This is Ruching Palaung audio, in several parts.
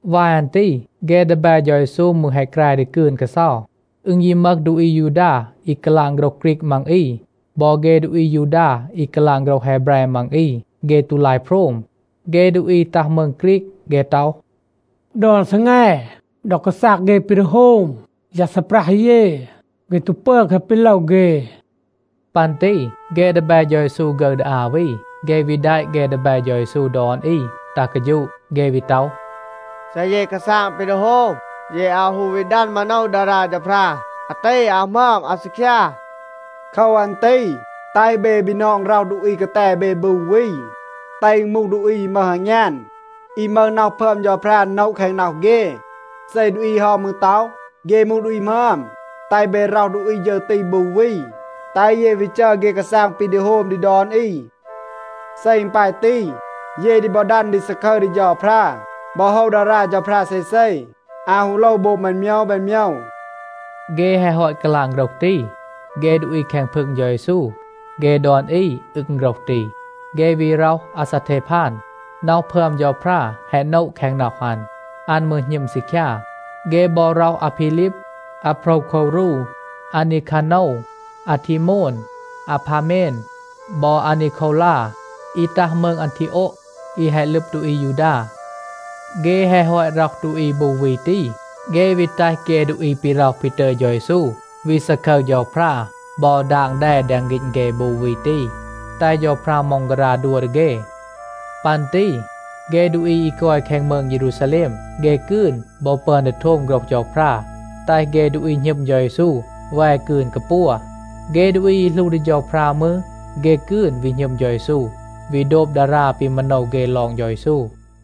วาย อัน ตี เฆ ดีแบ เฌา เยซู มืร แฮะ แกร ดี กืน กาเซา. อึณ ยี มึห ดูอี อายูดา อี กาลาง โฆรห ฆรีก มัง อี บอ เฆ ดูอี อายูดา อี กาลาง โฆรห แฮแบร มัง อี, เฆ ตู ลาย โพรม. เฆ ดูอี ตัห มืง ฆรีก, เฆ ต็อห, “ดอน ซีแง, ดอ กาซาง เฆ ปี ดี โฮม, ยา ซีปรัห เย, เฆ ตู ปึอน แคะ ปี โลว เฆ.” ปัน ตี เฆ ดีแบ เฌา เยซู ฆึร ดี อา วี, เฆ วี แดะ เฆ ดีแบ เฌา เยซู ดอน อี ตัห กาฌูะ. เฆ วี ต็อห, “เซ เย กาซาง ปี ดี โฮม, เย อาว ฮู วี ดัน มาโนว ดารา เฌาพรา. อาตี อาว หมึอม, อาว ซีคยา. โคว อัน ตี แตห เบ บีนอง ร็อห ดูอี กาแต เบ บู วี. แตห อึณ มูห ดูอี อี มึห อางยาน, อี มึห น็อห พึอม เฌาพรา โนะ แคง น็อห เฆ. เซ ดูอี เฮา มืร ต็อห, เฆ มูห ดูอี หมึอม, แตห เบ ร็อห ดูอี ฌึร ตี บู วี, แตห เย วี จัร เฆ กาซาง ปี ดี โฮม ดี ดอน อี. เซ อึณ ปาย ตี, เย ดี บอ ดัน ดี ซาคึร ดี เฌาพรา บอ โฮว ดารา เฌาพรา เซเซ, อาว ฮู โลว โบง แบน โมยว แบน โมยว.” เฆ แฮะ ฮอต กาลาง โฆรห ตี, เฆ ดูอี แคง พึง เฌา เยซู, เฆ ดอน อี อึง โฆรห ตี. เฆ วี ร็อห อาซาเทพาน. น็อห พึอม เฌาพรา แฮะ โนะ แคง น็อห อัน. อัน มืร หณึม ซีคยา. เฆ บอ ร็อห อาพีลีบ, อาโพรวโควรู, อานีคาโนว, อาทีโมน, อาพาเมน บอ อานีโควลา, อี ตัห มืง อันทีโอะ, อี แฮะ ลึบ ดูอี อายูดา. เฆ แฮะ ฮอต ร็อห ดูอี บู วี ตี, เฆ วี แตห เฆ ดูอี ปี ร็อห ปี ตึย เฌา เยซู วี ซาคึร เฌาพรา บอ ดาง แด แดง ฆีณ เฆ บู วี ตี, แตห เฌาพรา ม็องการา ดัว ดี เฆ. ปัน ตี เฆ ดูอี อี กอย แคง มืง เยรูซาแลม, เฆ กืน บอ ปึอน ดี โทม โฆรห เฌาพรา, แตห เฆ ดูอี หณึม เฌา เยซู แว กืน กาปัว. เฆ ดูอี อี หลู ดี เฌาพรา มืร, เฆ กืน วี หณึม เฌา เยซู, วี โดบ ดารา ปี มาโนว เฆ ลอง เฌา เยซู.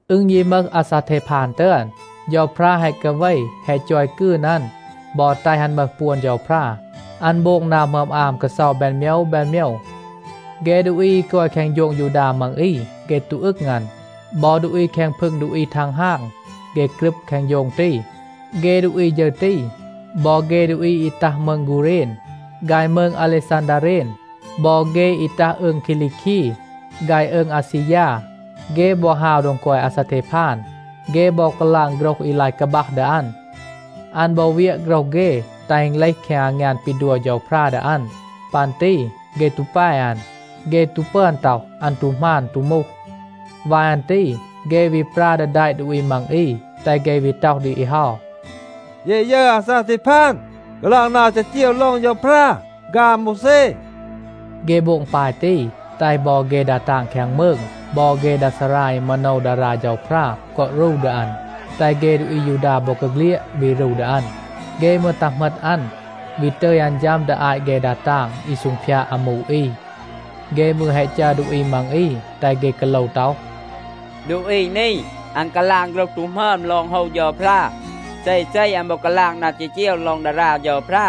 อึณ ยี มึห อาซาเทพาน ตึอน, เฌาพรา แฮะ กาเว แฮะ จอย กืน อัน บอ แตห อัน มึห ปวน เฌาพรา. อัน โบง นา หมึอม อาม กาเซา แบน โมยว แบน โมยว. เฆ ดูอี อี กอย แคง โฌง ยูดา มัง อี, เฆ ตู อึง อัน. บอ ดูอี แคง พึง ดูอี ทังฮาง, เฆ กรึบ แคง โฌง ตี. เฆ ดูอี ฌึร ตี, บอ เฆ ดูอี อี ตัห มืง กูเรณ ฆาย มืง อาเลซันดาเรน บอ เฆ อี ตัห อืง คีลีคี ฆาย อืง อาซียา, เฆ บอ ฮาว โดง กอย อาซาเทพาน. เฆ บอ กาลาง โฆรห อี ลาย กาบัห ดี อัน. อัน บอ เวียะ โฆรห เฆ, แตห อึณ เลห แคง อางยาน ปี ดัว เฌาพรา ดี อัน. ปัน ตี เฆ ตู แป อัน. เฆ ตู ปึอน ต็อห, อัน ตู หมาน, ตู มูห. วาย อัน ตี เฆ วี ปรา ดี แดะ ดูอี มัง อี, แตห เฆ วี ต็อห ดี อี เฮา, “เย แฮะ ยึร อาซาเทพาน กาลาง นา จีจีว ลอง เฌาพรา ฆาย อาโมวแซ.” เฆ โบง ปาย ตี, แตห บอ เฆ ดา ตาง แคง มืง บอ เฆ ดา ซารา อี มาโนว ดารา เฌาพรา กอ รู ดี อัน, แตห เฆ ดูอี อายูดา บอกาเฆลียด วี รู ดี อัน. เฆ มืร ตัห เหมต อัน, วี ตึย อัน ฌัม ดี อาต เฆ ดา ตาง อี ซูงพยาด อามู อี. เฆ มืร แฮะ จัร ดูอี มัง อี, แตห เฆ กาโลว ต็อห, “ดูอี นี, อัน กาลาง โฆรห ตู หมึอม ลอง โฮว เฌาพรา. เซเซ, อัน บอ กาลาง นา จีจีว ลอง ดารา เฌาพรา.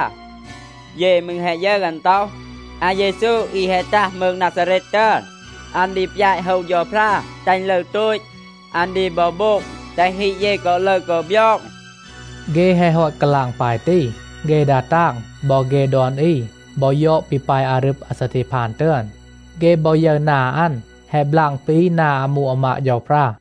เย มืร แฮะ ยึร อัน ต็อห, ‘อาเยซู อี แฮะ ตัห มืง นาซาเรต ตึอน, อัน ดี ปยาต โฮว เฌาพรา, แตห อึณ ลึร โตต. อัน ดี บอ โบง, แตห ฮีด เย กอ ลึร กอ บยอง.’” เฆ แฮะ ฮอต กาลาง ปาย ตี, เฆ ดา ตาง บอ เฆ ดอน อี บอ ยอด ปี ปาย อารึบ อาซาเทพาน ตึอน. เฆ บอ ยึร นา อัน แฮะ บลาง ปี นา อามู อามาด เฌาพรา.